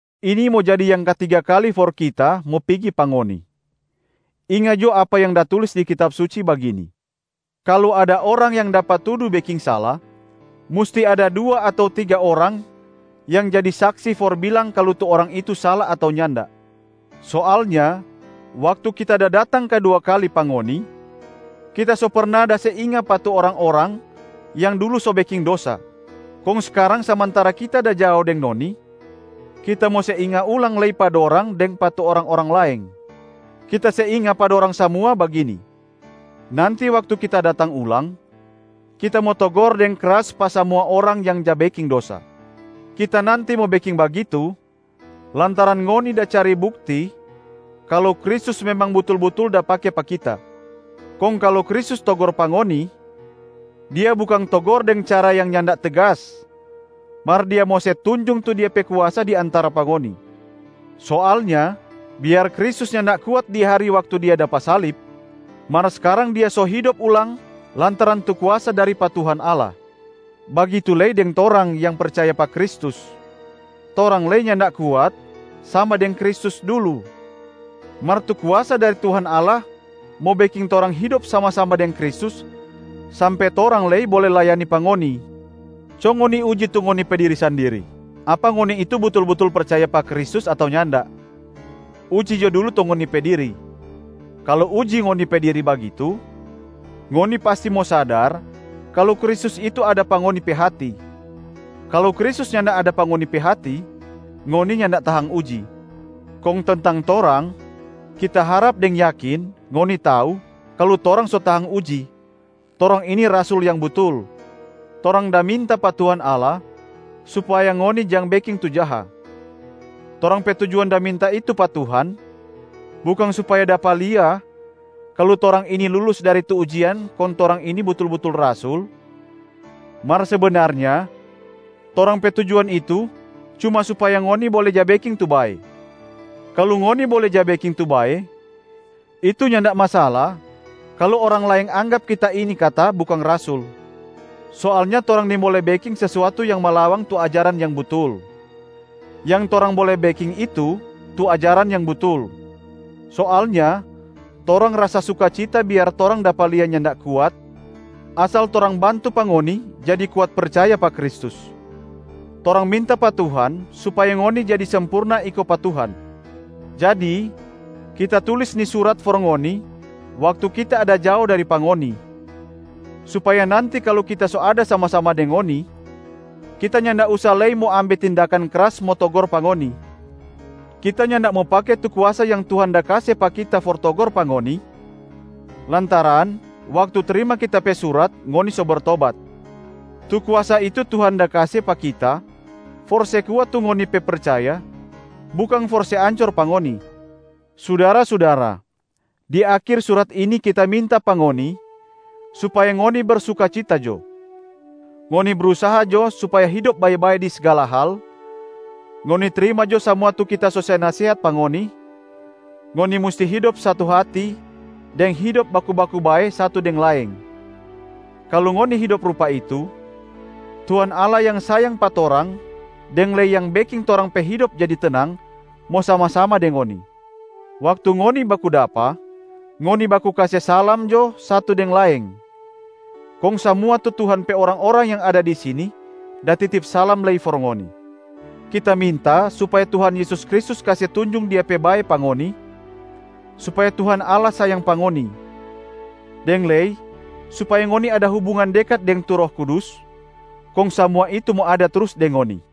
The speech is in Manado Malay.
Ini mo jadi yang katiga kali for kita mo pigi pa ngoni. Inga jo apa yang da tulis di Kitab Suci bagini, “Kalu ada orang yang dapa tudu beking sala, musti ada dua ato tiga orang yang jadi saksi for bilang kalu tu orang itu sala ato nyanda.” Soalnya waktu kita da datang kadua kali pa ngoni, kita so perna da se inga pa tu orang-orang yang dulu so beking dosa. Kong skarang samantara kita da jao deng ngoni, kita mo se inga ulang lei pa dorang deng pa tu orang-orang laeng. Kita se inga pa dorang samua bagini: nanti waktu kita datang ulang, kita mo togor deng kras pa samua orang yang ja beking dosa. Kita nanti mo beking bagitu lantaran ngoni da cari bukti kalu Kristus memang butul-butul da pake pa kita. Kong kalu Kristus togor pa ngoni, Dia bukang togor deng cara yang nyanda tegas mar Dia mo se tunjung tu Dia pe kuasa di antara pa ngoni. Soalnya biar Kristus nyanda kuat di hari waktu Dia dapa salib, mar skarang Dia so hidop ulang lantaran tu kuasa dari pa Tuhan Allah. Bagitu lei deng torang yang percaya pa Kristus, torang lei nyanda kuat sama deng Kristus dulu, mar tu kuasa dari Tuhan Allah mo beking torang hidop sama-sama deng Kristus sampe torang lei bole layani pa ngoni. Co ngoni uji tu ngoni pe diri sandiri, apa ngoni itu butul-butul percaya pa Kristus ato nyanda. Uji jo dulu tu ngoni pe diri! Kalu uji ngoni pe diri bagitu, ngoni pasti mo sadar kalu Kristus itu ada pa ngoni pe hati. Kalu Kristus nyanda ada pa ngoni pe hati, ngoni nyanda tahang uji. Kong tentang torang, kita harap deng yakin ngoni tau kalu torang so tahang uji, torang ini rasul yang butul. Torang da minta pa Tuhan Allah supaya ngoni jang beking tu jaha. Torang pe tujuan da minta itu pa Tuhan bukang supaya dapa lia kalu torang ini lulus dari tu ujian kong torang ini butul-butul rasul, mar sebenarnya torang pe tujuan itu cuma supaya ngoni bole ja beking tu bae. Kalu ngoni bole ja beking tu bae, itu nyanda masala kalu orang laeng anggap kita ini kata bukang rasul. Soalnya torang nimbole beking sesuatu yang malawang tu ajaran yang butul, yang torang bole beking itu tu ajaran yang butul. Soalnya torang rasa sukacita biar torang dapa lia nyanda kuat asal torang bantu pa ngoni jadi kuat percaya pa Kristus. Torang minta pa Tuhan supaya ngoni jadi sempurna iko pa Tuhan. Jadi kita tulis ni surat for ngoni waktu kita ada jao dari pa ngoni, supaya nanti kalu kita so ada sama-sama deng ngoni, kita nyanda usa lei mo ambe tindakan kras mo togor pa ngoni. Kita nyanda mo pake tu kuasa yang Tuhan da kase pa kita for togor pa ngoni lantaran waktu trima kita pe surat ngoni so bertobat. Tu kuasa itu Tuhan da kase pa kita for se kuat tu ngoni pe percaya, bukang for se ancor pa ngoni. Sudara-sudara, di akhir surat ini kita minta pa ngoni supaya ngoni bersukacita jo. Ngoni brusaha jo supaya hidop bae-bae di sgala hal, ngoni trima jo samua tu kita so se nasehat pa ngoni. Ngoni musti hidop satu hati deng hidop baku-baku bae satu deng laeng. Kalu ngoni hidop rupa itu, Tuhan Allah yang sayang pa torang deng lei yang beking torang pe hidop jadi tenang mo sama-sama deng ngoni. Waktu ngoni baku dapa, ngoni baku kase salama jo satu deng laeng. Kong samua tu Tuhan pe orang-orang yang ada di sini da titip salam lei for ngoni. Kita minta supaya Tuhan Yesus Kristus kase tunjung Dia pe bae pa ngoni, supaya Tuhan Allah sayang pa ngoni, deng lei supaya ngoni ada hubungan dekat deng tu Roh Kudus, kong samua itu mo ada trus deng ngoni.